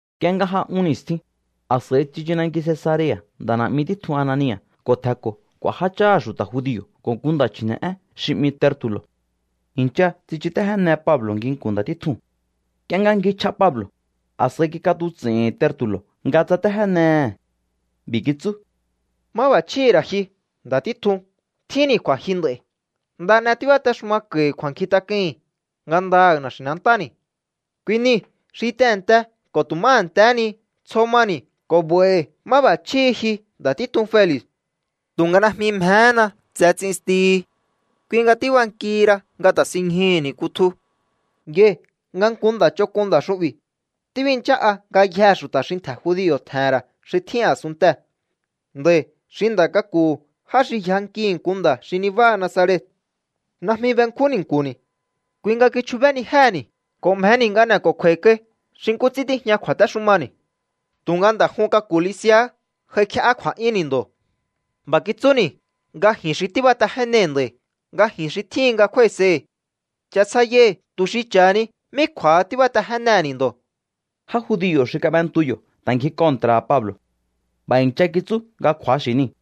Nk'ie nga j'a un ni̱stjin, a̱s'a̱i tsichu nanki Cesarea̱ nda̱ na̱'mi títjun Anania̱ ko̱ tje̱nko̱ k'u̱a̱ jácháha̱ xu̱ta̱ judio̱ ko̱ nku nda̱ chji̱ne̱'én xi 'mi Tertu̱lo̱. I̱ncha tsichutéjéne Pablo̱ nginku̱n nda̱ títjuu̱n. Nk'ie nga ngjichj'a Pablo̱, a̱s'a̱i kik'atuts'i̱hi̱n Tertu̱lo̱ nga tsatéjénehe̱. B'i̱ kitsú: —Máb'a̱chjíhi̱ ra̱ ji, nda̱ títjun, tjínni̱ kju̱a̱jyu nd'a̱i̱. Nda n'e tíbatexumako̱i̱ kju̱a̱nkjintak'uhi̱n ngandaha̱ na̱xi̱nantáni̱. Kui nii̱ xi tehe̱nte ko̱ tu̱ má a̱ntehé ni tsjo mani̱ ko̱ 'ba̱i̱hi̱ máb'a̱chjíhi̱ ji, nda̱ títjun Feli̱. Tu̱nga najmi mjehéna tse ts'instihi. Kui nga tíbankihi ra nga ta̱sinñjuhu̱ni̱ kutju. ’Yai̱ nga nku nda̱ ch'onk'un nda̱ xu'bi̱. Tíbinchá'a ngayjee̱ xu̱ta̱ xi ntje̱ judio̱ tje̱he̱n ra̱ xi tjín a̱sunntee̱. Nda̱i̱ xi nda̱ k'aku̱hu̱ já xi yjankihi̱ nku nda̱ xi nibáha Nazaret. Najmi benkjún ni̱nku̱ni̱. Kui nga kichjubénijéhe̱ni̱ ko̱ mjeni̱ nga n'e̱ko̱kju̱a̱i̱ kai xi nkú ts'ín tíjña kju̱a̱téxumani̱. Tu̱nga nda̱ jun k'aku̱ Lisi̱a̱há j'aikje'á kju̱a̱'yúnni̱ ndo̱. B'a̱ kitsúni̱ nga ji̱n xi tíbatejénei̱ nda̱i̱, nga ji xi tjíhin nga kjúái̱sei̱hi̱. Cha̱sjaiyaihi̱ tu̱ xi cha̱hani mí kju̱a̱ha tíbatejénehe̱ni̱ ndo̱. Já judio̱ xi kab'entu yo̱ ta̱ ngji kontra̱ha̱ Pablo̱. B'a̱ i̱ncha kitsú nga kju̱axi̱ niu̱.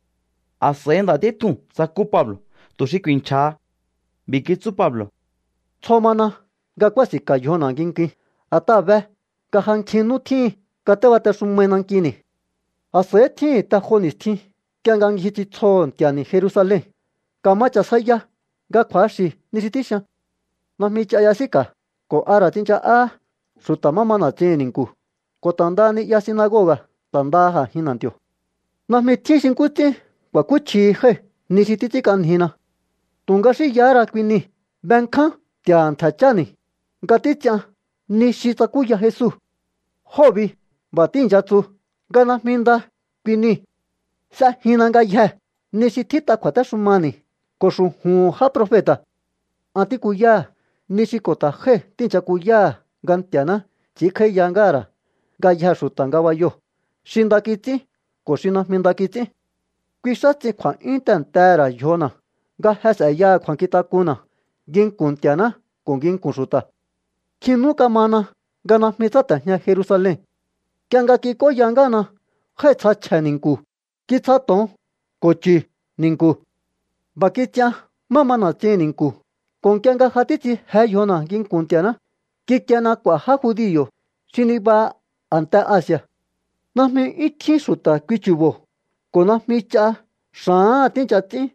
A̱s'a̱i nda̱ títjuu̱n tsakú Pablo̱ tu̱ xi ku̱i̱nchja̱ha. B'i̱ kitsú Pablo̱: —Tsjo mana nga kúási̱nka̱ yjona̱ nginkuin, a̱t'aha̱ be nga ja nkjin nú tjíhi̱n nga tíbatexumaihi̱ nankini̱. A̱s'a̱ihí tjíhi̱n te jo ni̱stjin nk'ie nga ngji ts'intsjoho̱ Nti̱a̱ni̱ Jerusalen. Ka̱ma cha̱sjaya nga kju̱axi̱ ni xi tíxian. Najmi ch'a y'esíka̱ ko̱ a ra̱ tsincha'á xu̱ta̱ má ma na̱tsihi̱n ni̱nku̱, ko̱ ta̱ ndaha ni'ya sinagoga̱, ta̱ ndaha a̱jin na̱nti̱o̱. Najmi tjín xi nkú ts'ín ku̱a̱kúchjihi jái̱ ni xi títs'ínk'anjina. ’Tu̱nga xínyahá ra kui nii̱. Benkján Nti̱a̱ha̱ ntje̱ cháni̱ nga títs'ian ni xi tsakúya Jesu. Jóo̱ bi b'a̱ tíi̱ncha tsu nga najmi nda kui niu̱. S'ejinna ngayjee̱ ni xi tjít'a kju̱a̱téxumani̱ ko̱ xu̱ju̱hu̱n já profeta̱. An tíkuyáha̱ ni xi ko̱ ta̱ jái̱ tíi̱ncha kuyáha̱, nga Nti̱a̱ná ts'i̱ínkj'áíya ngáha̱ ra̱ ngayjee̱ xu̱ta̱ ngabayoo̱, xi nda kits'ín ko̱ xi najmi nda kits'ín. Kui xáha ts'in kju̱a̱'yún tehe̱ntehe̱ ra̱ yjona̱ nga je s'e̱yaha kju̱a̱nkjintak'unna̱ nginku̱n Nti̱a̱ná ko̱ nginku̱n xu̱ta̱. ’Nkjin nú kamana nga najmi tsáte̱jña Jerusalen. Nk'ie nga kik'óya ngáhana, jái̱tsja chje̱ ni̱nku̱. Kitsja to̱on ko̱ chu̱ ni̱nku̱. B'a̱ kits'ian má ma na̱tsihi̱n ni̱nku̱ ko̱ nk'ie nga ja títs'in je yjona̱ nginku̱n Nti̱a̱ná, kikiena k'u̱a̱ já judio̱ xi niba a̱nte Asi̱a̱. Najmi 'yún tjín xu̱ta̱ kui chu̱bo̱ ko̱ najmi ch'a xa̱áha̱n tíi̱ncha ts'ín.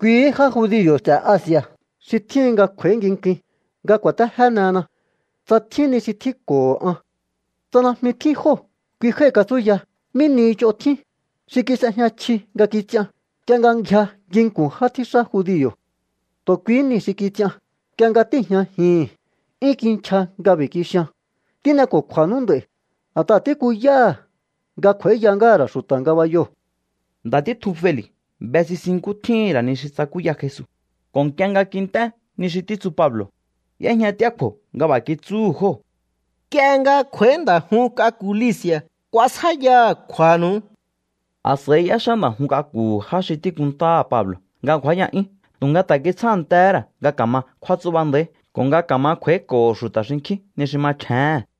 Kuihí já judio̱ ts'e̱ Asi̱a̱ xi tjíhin nga kj'u̱a̱í ngikuin nga ku̱a̱téjénehena tsa tjín ni xi tjínko̱ho̱ an. ’Tsa najmi tjín jóo̱, kui jái̱ katsúya mí ni ch'on tjíhin xi kis'ejña chji nga kits'ian nk'ie nga ngjia nginku̱n já tjíxá judio̱. Tu̱ kuihí nii̱ xi kits'ian. Nk'ie nga tíi̱jñajihi̱n, 'yún kinchja nga b'i̱ kixian: “Tín'eko̱kju̱a̱nú nd'a̱i̱ a̱t'aha̱ tíkuyáha̱ nga kj'u̱a̱íya ngáha̱ ra̱ xu̱ta̱ ngabayoo̱.” Nda̱ títjun Feli̱ be sisin nkú tjíhi̱n ra̱ ni xi tsakúya Jesu, ko̱ nk'ie nga kint'é ni xi títsu Pablo̱, y'éjñat'íá kju̱o̱ nga b'a̱ kitsúhu̱ jóo̱: —Nk'ie nga kj'u̱a̱í nda̱ jun k'aku̱ Lisi̱a̱, kuasjáíyaha̱ kju̱a̱nu̱u. A̱s'a̱i y'éxá nda̱ jun k'aku̱hu̱ já xi tíkuntáha̱ Pablo̱ nga ngju̱áya'yún tu̱nga ta̱ kitsjántehé ra̱ nga ka̱ma kjúátsú'ba nda̱í ko̱ nga ka̱ma kj'u̱a̱íko̱ho̱ xu̱ta̱ xinkjín ni xi machjéhe̱n.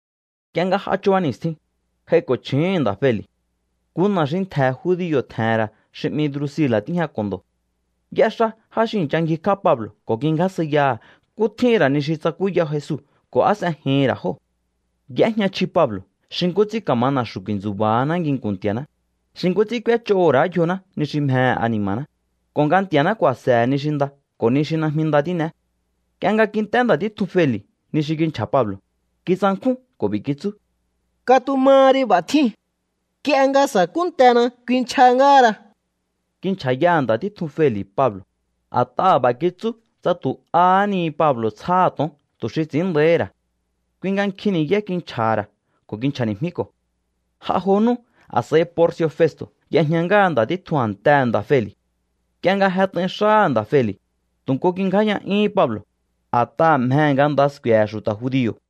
Nk'ie nga j'a chuba ni̱stjin, j'aiko̱ chju̱úhu̱n nda̱ Feli̱. Nku na̱ xi ntje̱ judio̱ tje̱he̱n ra̱ xi 'mi Drusila̱ tíjñako̱ ndo̱. Y'éxá já xi i̱ncha ngjikj'á Pablo̱ ko̱ kingjásjaiyaha̱ nkú tjíhi̱n ra̱ ni xi tsakúya Jesu ko̱ á s'ejihi̱n ra̱ jóo̱. Y'éjña chji Pablo̱ xi nkú ts'ín ka̱ma na̱xu̱ ku̱i̱ntsu̱ba̱haná nginku̱n Nti̱a̱ná, xi nkú ts'ín k'úéch'oho̱ ra̱á yjoná ni xi mjehe̱ ani̱ma̱ná, ko̱ nga Nti̱a̱ná ku̱a̱se̱he̱ ni xi nda ko̱ ni xi najmi nda tín'eé. Nk'ie nga kint'é nda̱ títjun Feli̱ ni xi kinchja̱ Pablo̱, kitsankjún ko̱ b'i̱ kitsú: —Katumaha ri, b'a̱ tjíu̱n. Nk'ie nga sa̱kúntena kuinchja ngáhara. Kinchja̱ yaha̱ nda̱ títjun Feli̱ Pablo̱, a̱t'aha̱ b'a̱ kitsú tsa tu̱ ahá ni Pablo̱ tsjáha̱ to̱on tu̱ xi ts'i̱ín nda̱íhi̱ ra̱. Kui nga nkjin ni̱yá kinchja̱ha̱ ra̱ ko̱ kinchja̱ni̱jmíko̱. J'a jo nú, a̱s'a̱i Porci̱o̱ Festo̱ y'ejña ngáha nda̱ títjun a̱ntehe̱ nda̱ Feli̱. Nk'ie nga jet'ain xáha̱ nda̱ Feli̱, tu̱ nku kingjáya'yúhún Pablo̱, a̱t'aha̱ mjehe̱ nga nda sku̱e̱he̱ xu̱ta̱ judio̱.